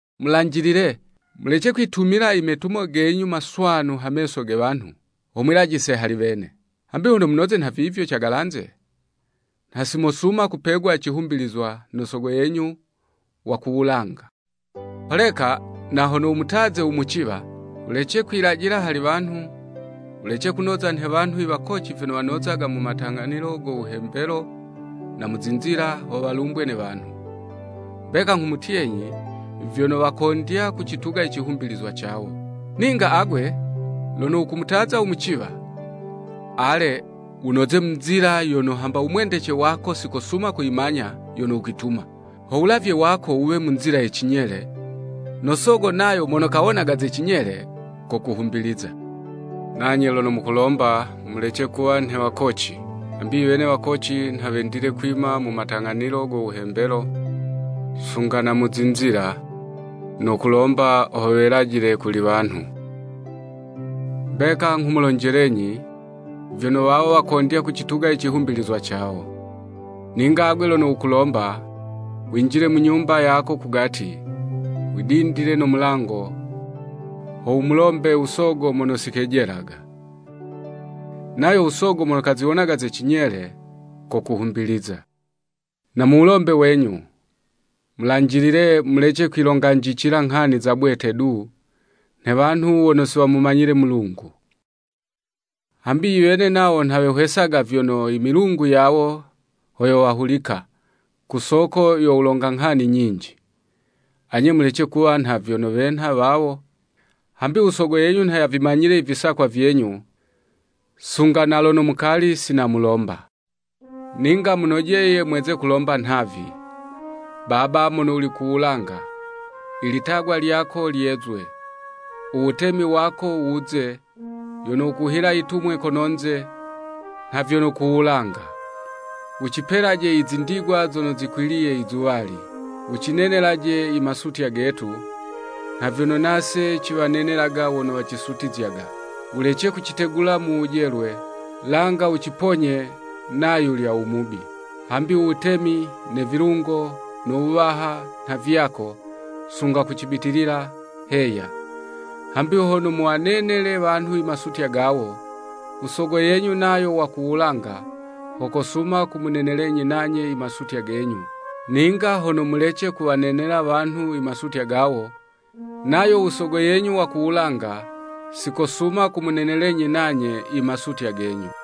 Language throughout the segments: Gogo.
“Mulanjilile, mulece kwitumila i metumo genyu maswanu ha meso ge wanhu, ho mwilajise hali wene. Hambi hono munoze nhavivyo cagalanze, nha si mosuma kupegwa icihumbilizwa no Sogo yenyu wa ku wulanga. “Holeka na hono wumutaze u muciwa, wulece kwilajila hali wanhu, wulece kunoza nhe wanhu iwakoci vyono wanozaga mu matanganilo go wuhembelo, na mu zinzila, ho walumbwe ne wanhu. Mbeka nghumutyenyi vyono, wakondya kucituga icihumbilizwa cawo. “Ninga agwe, lono wukumutaza u muciwa, ale wunoze mu nzila yono hamba u mwendece wako si kosuma kuyimanya yono wukwituma. Ho wulavye wako wuwe mu nzila ye cinyele, no Sogo nayo mono kawonaga ze cinyele, kokuhumbiliza.” “Nanye lono mukulomba, mulece kuwa nhe wakoci. Hambi iwene wakoci, nha wendile kwima wima mu matang'anilo go wuhembelo, sunga na mu zinzila, no kulomba, ho welajile kuli wanhu. Mbeka nghumulonjelenyi, vyono wawo wakondya kucituga icihumbilizwa cawo. Ninga agwe lono wukulomba, winjile mu nyumba yako kugati, widindile no mulango, ho wumulombe u Sogo mono sikejelaga. Nayo u Sogo mono kaziwonaga ze cinyele kokuhumbiliza. “Na mu wulombe wenyu, mulanjilile, mulece kwilonganjicila nghani za bwete du, nhe wanhu wono si wamumanyile Mulungu. Hambi i wene wawo nha wehwesaga vyono, i milungu yawo ho yowahulika, ku soko yo wulonga nghani nyinji. Anye mulece kuwa nha vyono wenha wawo. Hambi u Sogo yenyu nha yavimanyile i visakwa vyenyu, sunga na lono mukali si namulomba. Ninga munojeye mweze kulomba nhavi: ‘Baba mono wuli ku wulanga, Ilitagwa lyako lyezwe, U wutemi wako wuze yono wukuhila yitumwe kono'nze nha vyono ku wulanga. Wucipelaje izindigwa zono zikwiliye izuwali. Wucinenelaje imasutya getu, nha vyono nase ciwanenelaga wono wacisutizyaga. Wulece kucitegula mu wujelwe, Langa wuciponye na yulya u Mubi.’” [Hambi u wutemi ne vilungo, no wuwaha nha vyako, sunga ku cibitilila. Heya.] “Hambi hono muwanenele wanhu imasutya gawo, u Sogo yenyu nayo wa ku wulanga, ho kosuma kumunenelenyi nanye imasutya genyu. Ninga hono mulece kuwanenela wanhu imasutya gawo, nayo u Sogo yenyu wa ku wulanga si kosuma kumunenelenyi nanye imasutya genyu.”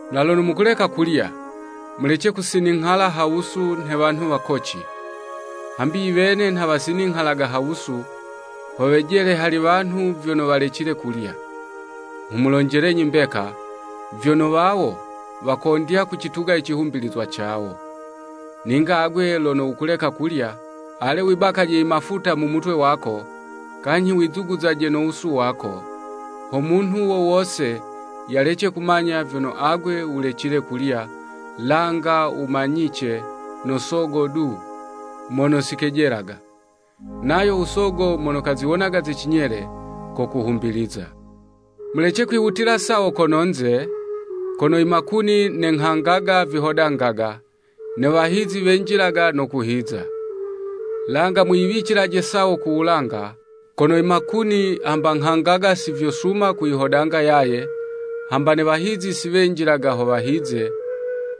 “Na lono mukuleka kulya, mulece kusininghala ha wusu nhe wanhu wakoci. Hamby iwene nha wasininghalaga ha wusu, ho wejele hali wanhu vyono walecile kulya. Nghumulonjelenyi mbeka, vyono wawo, wakondya kucituga icihumbilizwa cawo. Ninga agwe lono wukuleka kulya, ale wibakaje imafuta mu mutwe wako, kanyhi wizuguzaje no wusu wako, ho munhu wo wose yalece kumanya vyono agwe wulecile kulya, langa wumanyice no Sogo du, mono si kejelaga. Nayo u Sogo mono kaziwonaga ze cinyele, kokuhumbiliza.” “Mulece kwiwutila sawo kono'nze, kono imakuni ne nghangaga vihodangaga, ne wahizi wenjilaga no kuhiza. Langa mwiyiwicilaje sawo ku wulanga, kono imakuni hamba nghangaga si vyosuma kuyihodanga yaye, hamba ne wahizi si wenjilaga ho wahize.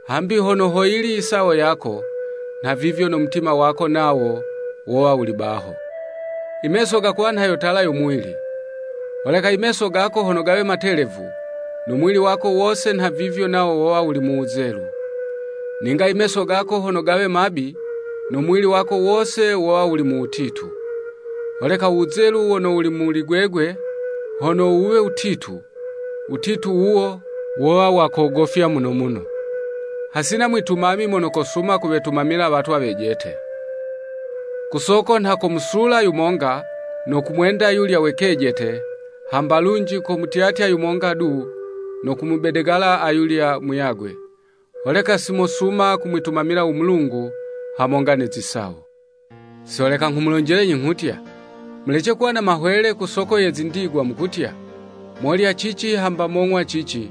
Hambi hono hoyili isawo yako, nhavivyo no mutima wako nawo, wowa wuli baho.” “Imeso gakuwa nha yo tala yo muwili. Holeka imeso gako hono gawe matelevu, no muwili wako wose nhavivyo nawo wowa wuli mu wuzelu. Ninga imeso gako hono gawe mabi, no muwili wako wose wowa wuli mu wutitu. Holeka uwuzelu wono wuli muli gwegwe hono wuwe wutitu, uwutitu wuwo, wowa wa kogofya muno muno.” “Hasina mwitumami mono kosuma kuwetumamila watwa wejete. Ku soko nha komusula yumonga, no kumwenda yulya we kejete, hamba lunji komutyatya yumonga du, no kumubedegala ayulya muyagwe. Holeka si mosuma kumwitumamila u Mulungu hamonga ne zisawo.” “Si holeka nghumulonjelenyi nghutya, mulece kuwa na mahwele ku soko ye zindigwa mukutya, molya cici hamba mong'wa cici,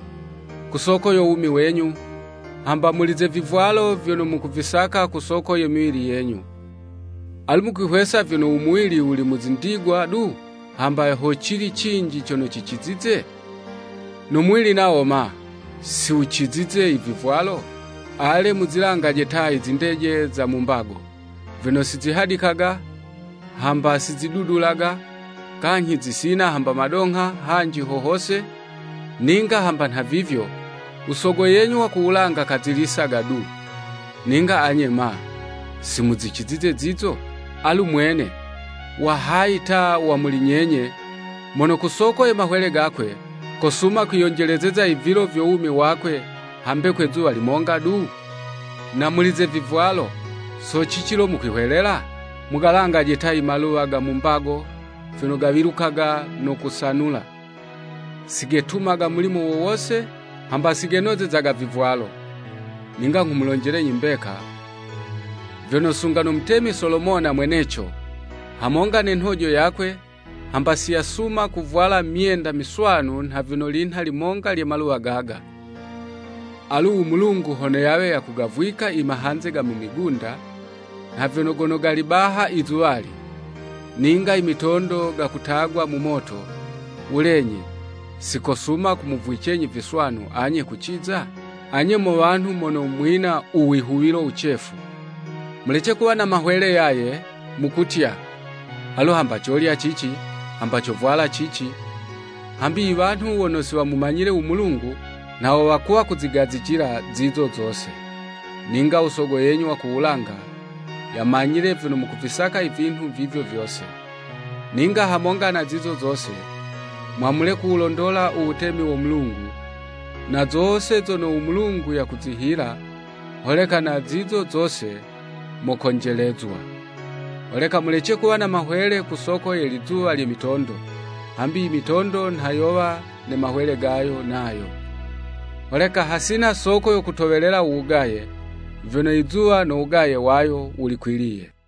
ku soko yo wumi wenyu, hamba muli ze vivwalo vyono mukuvisaka ku soko ye miwili yenyu. Alu mukwihwesa vyono u wumi wuli mu zindigwa du, hamba hocili cinji cono cicizize? No muwili nawo ma, si wucizize i vivwalo? Ale muzilangaje ta izindeje za mu mbago, vyono si zihadikaga, hamba si zidudulaga, kanyhi zisina hamba madongha hanji ho hose. Ninga hamba nhavivyo, u Sogo yenyu wa ku wulanga kazilisaga du. Ninga anye ma, si muzicizize zizo? Alu mwene, wa hayi ta wa muli nyenye, mono ku soko ye mahwele gakwe, kosuma kwiyonjelezeza ivilo vyo wumi wakwe hambe kwe zuwa limonga du? Na muli ze vivwalo, so cici lo mukwihwelela? Mugalangaje ta imaluwa ga mu mbago vyono gawilukaga no kusanula. Sigetumaga mulimo wo wose, hamba si genozezaga vivwalo. Ninga nghumulonjelenyi mbeka, vyono sunga no mutemi Solomona mweneco, hamonga ne nhojo yakwe, hamba si yasuma kuvwala myenda miswanu nha vyono linha limonga lye maluwa gaga. Alu u Mulungu hono yawe yakugavwika imahanze ga mu migunda nha vivyo gono gali baha izuwali, ninga imitondo gakutagwa mu moto, wulenyi, si kosuma kumuvwicenyi viswanu anye kuciza? Anye mo wanhu mono mwina u wihuwilo wucefu! Mulece kuwa na mahwele yaye, mukutya, ‘Alu hamba colya cici, hamba covwala cici!’ Hambi iwanhu wono si wamumanyile u Mulungu, nha wo wakuwa kuzigazicila zizo zose. Ninga u Sogo yenyu wa ku wulanga, yamanyile vyono mukuvisaka ivinhu vivyo vyose. Ninga hamonga na zizo zose, mwamule kuwulondola u Wutemi wo Mulungu, na zose zono u Mulungu yakuzihila, holeka na zizo zose mokonjelezwa. Holeka mulece kuwa na mahwele ku soko ye lizuwa lye mitondo, hambi imitondo nha yowa ne mahwele gayo nayo. Holeka hasina soko yo kutowelela u wugaye, vyono izuwa no wugaye wayo wulikwiliye.”